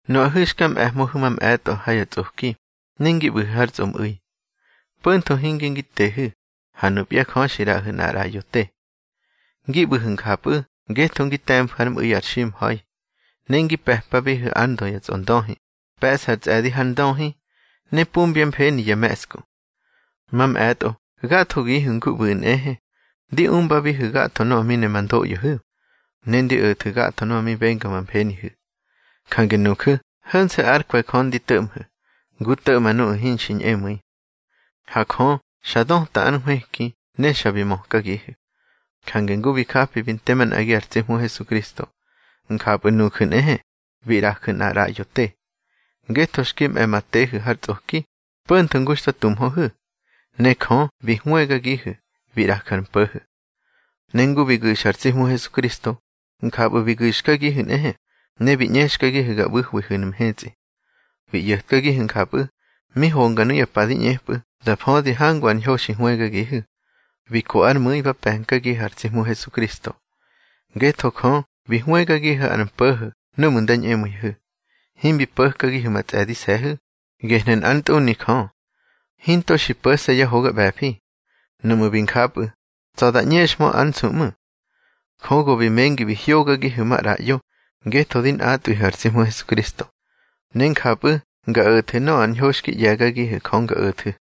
Nuꞌahu̱ xka mꞌe̱hmöhu̱ mamꞌe̱tꞌo ha ya tsꞌoki, ne ngi ꞌbu̱hu̱ har tsꞌomꞌu̱i, po̱ntho hinge ngi tehu̱, ha nupya Jö xi ꞌraꞌahu̱ nꞌar ꞌraꞌyo te. Ngi ꞌbu̱hu̱ njapꞌu̱ ngetho ngi te̱mfu̱ ár mꞌu̱i ar ximha̱i. Ne ngi pe̱pabihu̱ ár ndö ya tsꞌondöhi, pe̱ꞌsa ár tsꞌe̱di har ndöhi, ne pumbyá mfeni ya me̱ꞌsku. Mamꞌe̱tꞌo gathogihu̱ ngu ꞌbu̱ꞌu̱ nꞌehe, ndi umbabihu̱ gatho nöꞌö mi ne ma ndoꞌyohu̱, ne ndi o̱thu̱ gatho nöꞌö mi benga ma mfenihu̱. Jange nuju̱ ho̱nse̱ ár kwe̱ Jö ndi to̱ꞌmhu̱, ngu to̱ꞌma nuꞌu̱ hinxi ñꞌemu̱i. Ha Jö xa döta ár nhwëki ne xa bi mökagihu̱. Jange ngu bi japi bi nte manꞌagi ar tsi Hmu Hesukristo, njapꞌu̱ nuju̱ nꞌehe, bi ꞌraju̱ nꞌar ꞌraꞌyo te, ngetho xki mꞌe̱ ma tehu̱ har tsꞌoki, po̱ntho ngu xta tumhöhu̱, ne Jö bi hwëgagihu̱, bi ꞌraju̱ ar mpo̱ho̱. Ne ngu bi gu̱xa ar tsi Hmu Hesukristo, njapꞌu̱ bi gu̱xkagihu̱ nꞌehe, ne bi ꞌñexkagihu̱ ga ꞌbu̱hwihu̱nu̱ mhetsꞌi. Bi ꞌyo̱tkagihu̱ njapꞌu̱, mi honga nuya pa di ꞌñepꞌu̱ da födi hangu ar ñho xi hwëgagihu̱, bi ko ár mu̱i ba pe̱nkagihu̱ ar tsi Hmu Hesukristo. Ngetho Jö bi hwëgagihu̱ ar mpo̱ho̱ núꞌmu̱ nda ñꞌemu̱ihu̱. Himbi po̱kagihu̱ ma tsꞌe̱dise̱hu̱, gehnu̱ nꞌár ntꞌuni Jö. Hinto xi po̱se̱ yá hoga ꞌbe̱fi. Nuꞌmu̱ bi njapꞌu̱, tsa̱ da ꞌñexhmö ár nsu ꞌmu̱. Jö go bi mengi bi hyógagihu̱ maꞌraꞌyo ngetho di nꞌatꞌwihu̱ ar tsi Hmu Hesukristo, ne njapꞌu̱ nga o̱thu̱ nöꞌö ar ñho xki ꞌye̱gagihu̱ Jö nga o̱thu̱.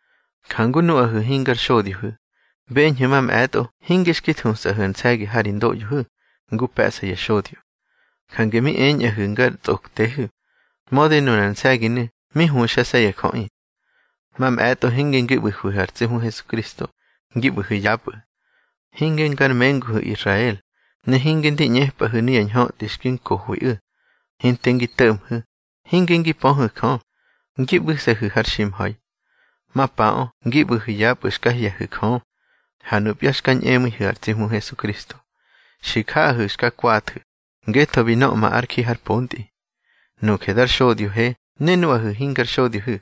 Jange nuꞌahu̱ hingar xodyohu̱, beñhu̱ mamꞌe̱tꞌo hinge xki thusꞌahu̱ ar nse̱gi ha ri ndoꞌyohu̱ ngu pe̱ꞌsa ya xodyo. Jange mi eñꞌahu̱ ngar tsꞌoktehu̱, mödi nunar nse̱ginu̱ mi huxase̱ ya jöꞌi. Mamꞌe̱tꞌo hinge ngi ꞌbu̱hwihu̱ ar tsi Hmu Hesukristo, ngi ꞌbu̱hu̱ yapꞌu̱. Hinge ngar menguhu̱ Israel, ne hinge ndi ꞌñepꞌahu̱ nuya ñhötꞌi xki nkohwiꞌu̱. Hinte ngi to̱ꞌmhu̱, hinge ngi pöhu̱ Jö, ngi ꞌbu̱se̱hu̱ har ximha̱i. Mapaꞌö ngi ꞌbu̱hu̱ yapꞌu̱ xka hye̱hu̱ Jö. Ha nupya xka ñꞌemu̱ihu̱ ar tsi Hmu Hesukristo, xi jaꞌahu̱ xka kwathu̱, ngetho bi nöꞌma ár ji har pontꞌi. Nuje dar xodyohe ne nuꞌahu̱ hingar xodyohu̱,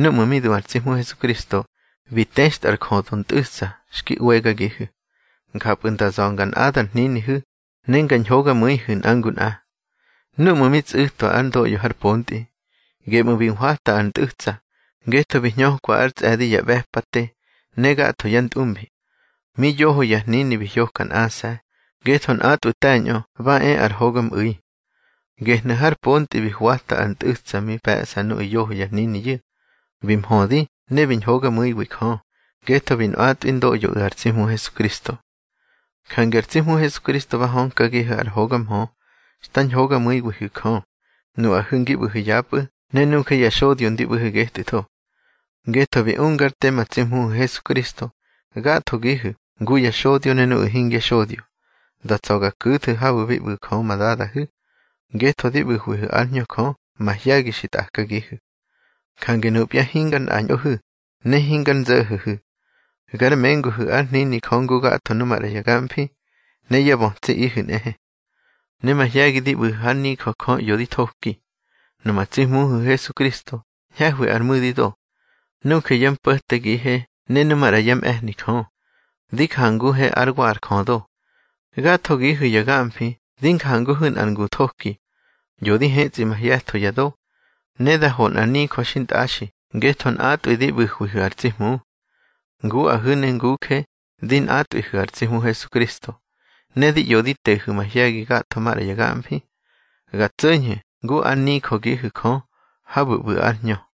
núꞌmu̱ mi du ar tsi Hmu Hesukristo bi textꞌa ar jödo ntꞌu̱tsa xki ꞌwegagihu̱. Njapꞌu̱ nda za̱ ngar nꞌada ar hninihu̱ ne nga ñhogamu̱ihu̱ nꞌa ngu nꞌa. Núꞌmu̱ mi tsꞌu̱twa ár ndoꞌyo har pontꞌi, geꞌmu̱ bi hwata ar ntꞌu̱tsa, ngetho bi hñökwa ár tsꞌe̱di ya ꞌbe̱pate ne gatho yá ntꞌumbi. Mi yoho ya hnini bi hyoka nꞌase̱, ngetho nꞌatꞌwu̱ te̱ñꞌö ba e ar hogamꞌu̱i. Gehnu̱ har pontꞌi bi hwata ar ntꞌu̱tsa mi pe̱ꞌsa nuꞌu̱ yoho ya hniniyu̱, bi mhödi ne bi ñhogamu̱iwi Jö, ngetho bi nꞌatwi ndoꞌyoꞌu̱ ar tsi Hmu Hesukristo. Jange ar tsi Hmu Hesukristo ba hönkagihu̱ ar hoga mhö xta ñhogamu̱iwihu̱ Jö, nuꞌahu̱ ngi ꞌbu̱hu̱ yapꞌu̱, ne nuje ya xodyo ndi ꞌbu̱he getꞌu̱tho. Ngetho bi ungár te ma tsi Hmuhu̱ Hesukristo, gathogihu̱ ngu ya xodyo ne nuꞌu̱ hingya xodyo, da tsa̱ ga ku̱thu̱ habu̱ bi ꞌbu̱ Jö ma Dadahu̱, ngetho di ꞌbu̱hwihu̱ ár Hñö Jö mahye̱gi xi tꞌakagihu̱. Jange nupya hingar nꞌañꞌohu̱, ne hingar nzo̱ho̱hu̱. Gar menguhu̱ ár hnini Jö ngu gatho nu maꞌra ya gamfi, ne yá bötsiꞌihu̱ nꞌehe. Ne mahye̱gi di ꞌbu̱hu̱ hár nijö Jö ꞌyo di thoki. Numa tsi Hmuhu̱ Hesukristo ñhe̱hwi ar mu̱dido. Nuje yá mpo̱tegihe ne nu maꞌra yá mꞌe̱hni Jö, di janguhe ár wa ar jödo. Gathogihu̱ ya gamfi di njanguhu̱ nꞌar ngu thoki, ꞌyo di hetsꞌi mahye̱tho ya do, ne da ho nꞌar nijö xintꞌaxi ngetho nꞌatꞌwi di ꞌbu̱hwihu̱ ar tsi Hmu. Nguꞌahu̱ ne nguje di nꞌatꞌwihu̱ ar tsi Hmu Hesukristo, ne di ꞌyo di tehu̱ mahye̱gi gatho maꞌra ya gamfi, ga tso̱ñhu̱ ngu ár nijögihu̱ Jö habu̱ ꞌbu̱ ár Hñö.